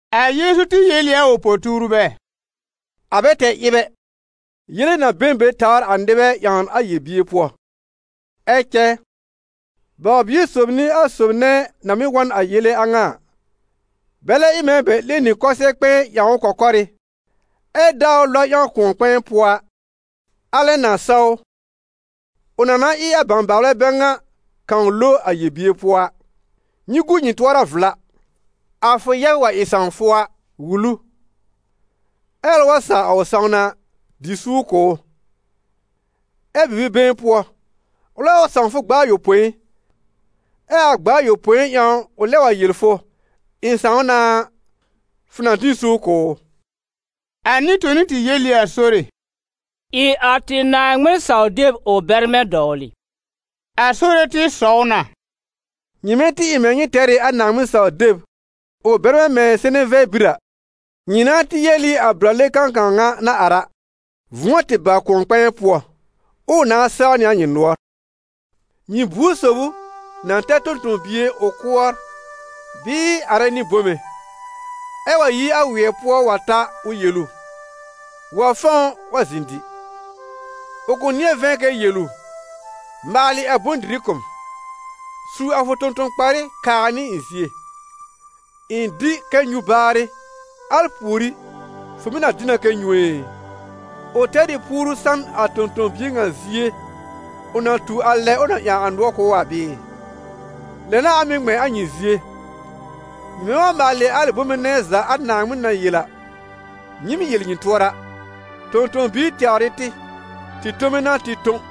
A Yeezu tɩ yel ɩ a ʋ po-tuurbɛ: «A bɛ tɛr ɩb ɛ, yele na be n be tawr a nɩbɛ ƴãwn a yel-bier pʋɔ. Ɛ cɛ baw-bio sob n'ɩ a sob nɛ na mɩ́ wa n a yele a ŋa a. Bɛlɛ ɩ mɛ̃ bɛ 'lẽ nɩ kʋsɛ-kpɛ̃ɛ ƴãw ʋ kɔ̀kɔ́rɩ́, ɛ daa ʋ lɔb ƴãw kʋ̃ɔ-kpɛ̃ɛ pʋɔ a, alɛ na sa ʋ, ʋ na na ɩ a bãbaalbɛ bɛ ŋa kãw ʋ lo a yel-bier pʋɔ a. Nyɩ gu nyɩ tʋɔra vla.» «A fʋ yɛb wa ɩ sãw fʋ a, wul ʋ; ɛ́ ʋlɛ wa saw a ʋ sãwna a, dɩ suur kʋ̀ ʋ. Ɛ bibi-been pʋɔ, ʋlɛ wa sãw fʋ gb'a ayopõi, ɛ a gb'a ayopõi ƴãw ʋ lɛb wa yel fʋ: ‹Ɩ̃ sãw na› a, fʋ na dɩ n suur kʋ̀ ʋ.» A nɩ-toni tɩ yel ɩ a Sore: «Ɩ a tɩ Naaŋmɩn saw-deb ʋ bɛrmɛ̃ dɔwlɩ.» A Sore tɩ sɔw na: «Nyɩmɛ tɩ ɩ mɛ̃ nyɩ tɛr ɩ a Naaŋmɩn saw-deb ʋ bɛrmɛ̃ mɛ̃ seneve bir a, nyɩ nãá tɩ yel ɩ a brale kãkãw ŋa na ar a: ‹Vʋ̃ɔ tɩ ba a kʋ̃ɔ-kpɛ̃ɛ pʋɔ›, ɛ ʋ nãá saw nɩ a nyɩ nʋɔr.» «Nyɩ buor sob ʋ na tɛr tõ-tõ-bie ʋ kʋɔr bɩɩ arɛ nɩ bome, ɛ wa yi a wɩɛ pʋɔ wa ta ʋ yel ʋ: ‹Wa fɔ̃w wa zɩ̃ dɩ?› Ʋ kʋ̃ nɩ̃ɛ vɛ̃ kɛ yel ʋ: ‹Maalɩ a bʋ̃-dɩrɩ kʋ̀ m, su a fʋ tõ-tõ-kparɩ kaa nɩ ɩ̃ zie, ɩ̃ dɩ kɛ nyũ baarɩ, al pùorí, fʋ mɩ̀ na dɩ na kɛ nyũ ɛ?› Ʋ tɛr ɩ puoru san a tõ-tõ-bie ŋa zie, ʋ na tu a lɛ ʋ na ƴãw a nʋɔr kʋ̀ ʋ a bɩɩ? Lɛ n'a a mɩ̀ ŋmɛ̃ a nyɩ zie: nyɩmɛ wa maalɩ a alɩ bome nɛ za a Naaŋmɩn na yel a, nyɩɩm yel nyɩ tʋɔra: ‹Tõ-tõ-biir tɛwr ɩ tɩ, tɩ tome n'a tɩ tõ.›»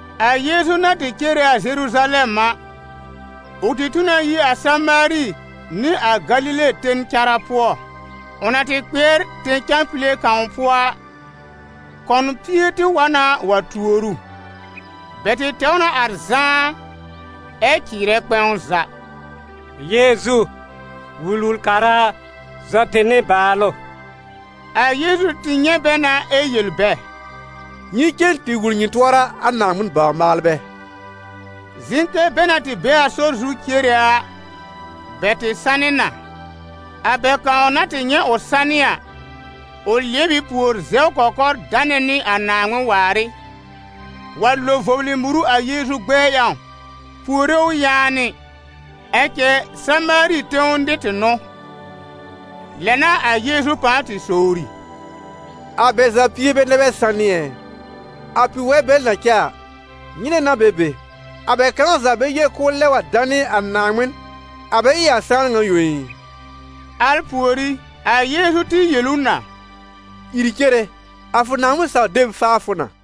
A Yeezu na tɩ cere a Zeruzalɛm a, ʋ tɩ tu na yi a Samaari nɩ a Galile ten cara pʋɔ. Ʋ na tɩ kpɩɛr tẽ-cãpile kãw pʋɔ a, kɔn pie tɩ wa na wa tuor ʋ. Bɛ tɩ tɛw na ar zãá, ɛ cɩɩrɛ kpɛ̃w za: «Yeezu, Wul-wul-kara a, zɔ tɩ nɩbaalʋ!» A Yeezu tɩ nyɛ̃ bɛ na ɛ yel bɛ: «Nyɩ cen tɩ wul nyɩ tʋɔra a Naaŋmɩn bawr-maalbɛ.» Zɩ̃ kɛ bɛ na tɩ be a sɔr zu cere a, bɛ tɩ sanɩ na. A bɛ kãw na tɩ nyɛ̃ ʋ sanɩ a, ʋ lɩɛb ɩ pùor zɛw kɔkɔr danɛ nɩ a Naaŋmɩn waar ɩ, wa lo vɔblɩ muru a Yeezu gbɛɛ ƴãw, puore ʋ yaanɩ. Ɛ cɛ Samaari tẽw nɩr tɩ n'ʋ. Lɛ n'a a Yeezu pãa tɩ sowri: «A bɛ za pie bɛ nɛ bɛ sanɩ ɛ? A pi-waɩ bɛl na cɛ a, nyɩnɛ n'a bɛ be? A bɛ kãw za bɛ yel k'ʋʋ lɛb wa danɩ a Naaŋmɩn, a bɛ ɩ a sãan ŋa yõ ɩ?» Al pùorí, a Yeezu tɩ yel ʋ na: «Ìr cere, a fʋ Naaŋmɩn saw-deb faa fʋ na.»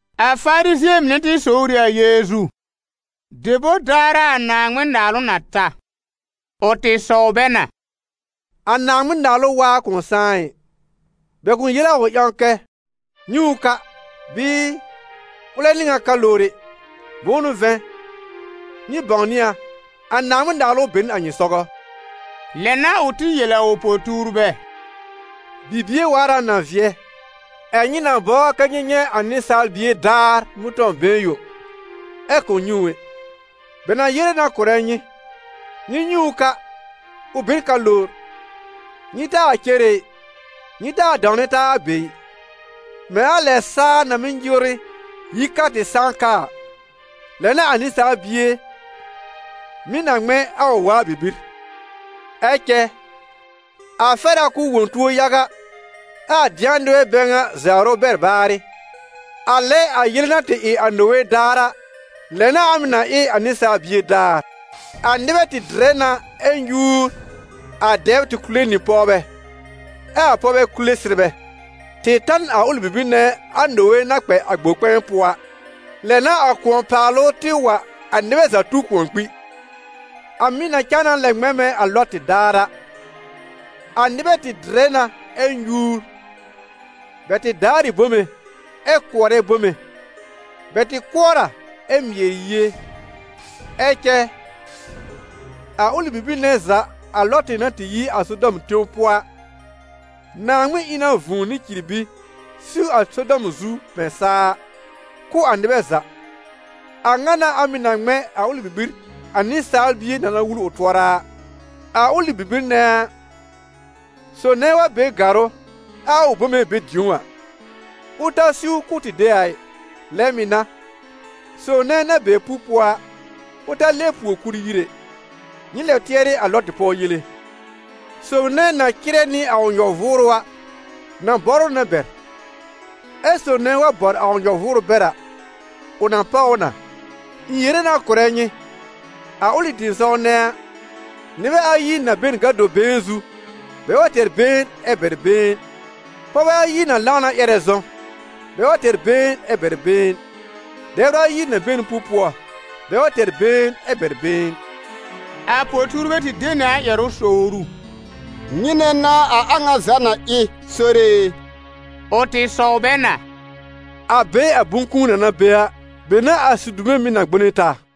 A Farizɩ̃ɛ mɩnɛ tɩ sowr ɩ a Yeezu: «Debor daar a a Naaŋmɩn-Naalʋ na ta?» Ʋ tɩ sɔw bɛ na: «A Naaŋmɩn-Naalʋ waa kʋ̃ sãá ɩ. Bɛ kʋ̃ yel a ʋ ƴãw kɛ: ‹Nyɛ̃ ʋ ka›, bɩɩ: ‹Ʋlɛ n'ɩ ŋan ka lowr ɛ›. Bʋ̃ʋ n'ʋ vɛ̃, nyɩ bãwnɩ a, a Naaŋmɩn-Naalʋ be n a nyɩ sɔgɔ. Lɛ n'a ʋ tɩ yel a ʋ po-tuurbɛ: «Bibie waar a na vɩɛ, ɛ̀ nyɩ na bɔbr kɛ nyɩ nyɛ̃ a Nɩsaal Bie daar mʋ̃tɔ̃-been yõ, ɛ kʋ̃ nyɛ̃ ʋ ɛ. Bɛ na yere na kʋ̀rɛ nyɩ: ‹Nyɩ nyɛ̃ ʋ ka, ʋ be n ka lowr.› Nyɩ taa cere ɩ, nyɩ taa dãwnɛ taa a be ɩ. Mɛ̃ a lɛ saa na mɩ́ nyɩwrɩ yi ka tɩ sãá ka a, lɛ n'a a Nɩsaal Bie mɩ̀ na ŋmɛ̃ a ʋ waa bibir. Ɛ cɛ a fɛr a k'ʋʋ wõ tuo yaga, ɛ́ a dɩ̃a nɩbɛ bɛ ŋa zawr ʋ bɛr baarɩ. A lɛ a yele na tɩ ɩ a Nowe daar a, lɛ n'a a mɩ̀ na ɩ a Nɩsaal Bie daar. A nɩbɛ tɩ dɩrɛ na ɛ nyúur, a dɛbr tɩ kule nɩ pɔwbɛ, ɛ a pɔwbɛ kule sɩrbɛ, tɩ ta n a ʋlɩ bibir nɛ a Nowe na kpɛ a gbor-kpɛ̃ɛ pʋɔ a; lɛ n'a a kʋ̃ɔ-paalʋ tɩ wa, a nɩbɛ za tu kʋ̃ɔ kpi. A mɩ̀ na cãa na lɛ ŋmɛ̃ mɛ̃ a Lɔtɩ daar a: a nɩbɛ tɩ dɩrɛ na ɛ nyúur, bɛ tɩ daar ɩ bome ɛ kʋɔrɛ bome, bɛ tɩ kʋɔr a ɛ mɩɛr yie; ɛ cɛ a ʋlɩ bibir nɛ za a Lɔtɩ na tɩ yi a Sodɔm tẽw pʋɔ a, Naaŋmɩn ɩ na vũu nɩ cirbi siw a Sodɔm zu mɛ̃ saa a, kʋ́ a nɩbɛ za. A ŋa n'a a mɩ̀ na ŋmɛ̃ a ʋlɩ bibir a Nɩsaal Bie na na wul ʋ tʋɔra a.» «A ʋlɩ bibir nɛ a, sob nɛ wa be gàrʋ́ ɛ a ʋ bome be dĩ̀ó a, ʋ ta siw k'ʋʋ tɩ de a ɩ; lɛ mɩ̀ n'a, sob nɛ na be pu-pʋɔ a, ʋ ta lɛb pùor kul yir ɛ. Nyɩ lɛb tɩɛrɩ a Lɔtɩ pɔw yele. Sob nɛ na cɩrɛ nɩ a ʋ nyɔ-vʋʋrʋ a, na bɔr ʋ na bɛr; ɛ́ sob nɛ wa bɔr a ʋ nyɔ-vʋʋrʋ bɛr a, ʋ na páw ʋ na. Ɩ̃ yere na kʋ̀rɛ nyɩ, a ʋlɩ tɩ̃ɩsɔw nɛ a, nɩbɛ ayi na be n gado-been zu, bɛ wa tɛr been ɛ bɛr been. Pɔwbɛ ayi na lãw na ƴɛrɛ zɔ̃, bɛ wa tɛr been ɛ bɛr been. [ Dɛbr ayi na be n pu-pʋɔ, bɛ wa tɛr been ɛ bɛr been.»] A po-tuurbɛ tɩ de nɩ a ƴɛrʋ sowr ʋ: «Nyɩnɛ n'a a a ŋa za na ɩ, Sore e?» Ʋ tɩ sɔw bɛ na: «A be a bʋ̃-kũu na na be a, be n'a a sidume mɩ̀ na gbone taa.»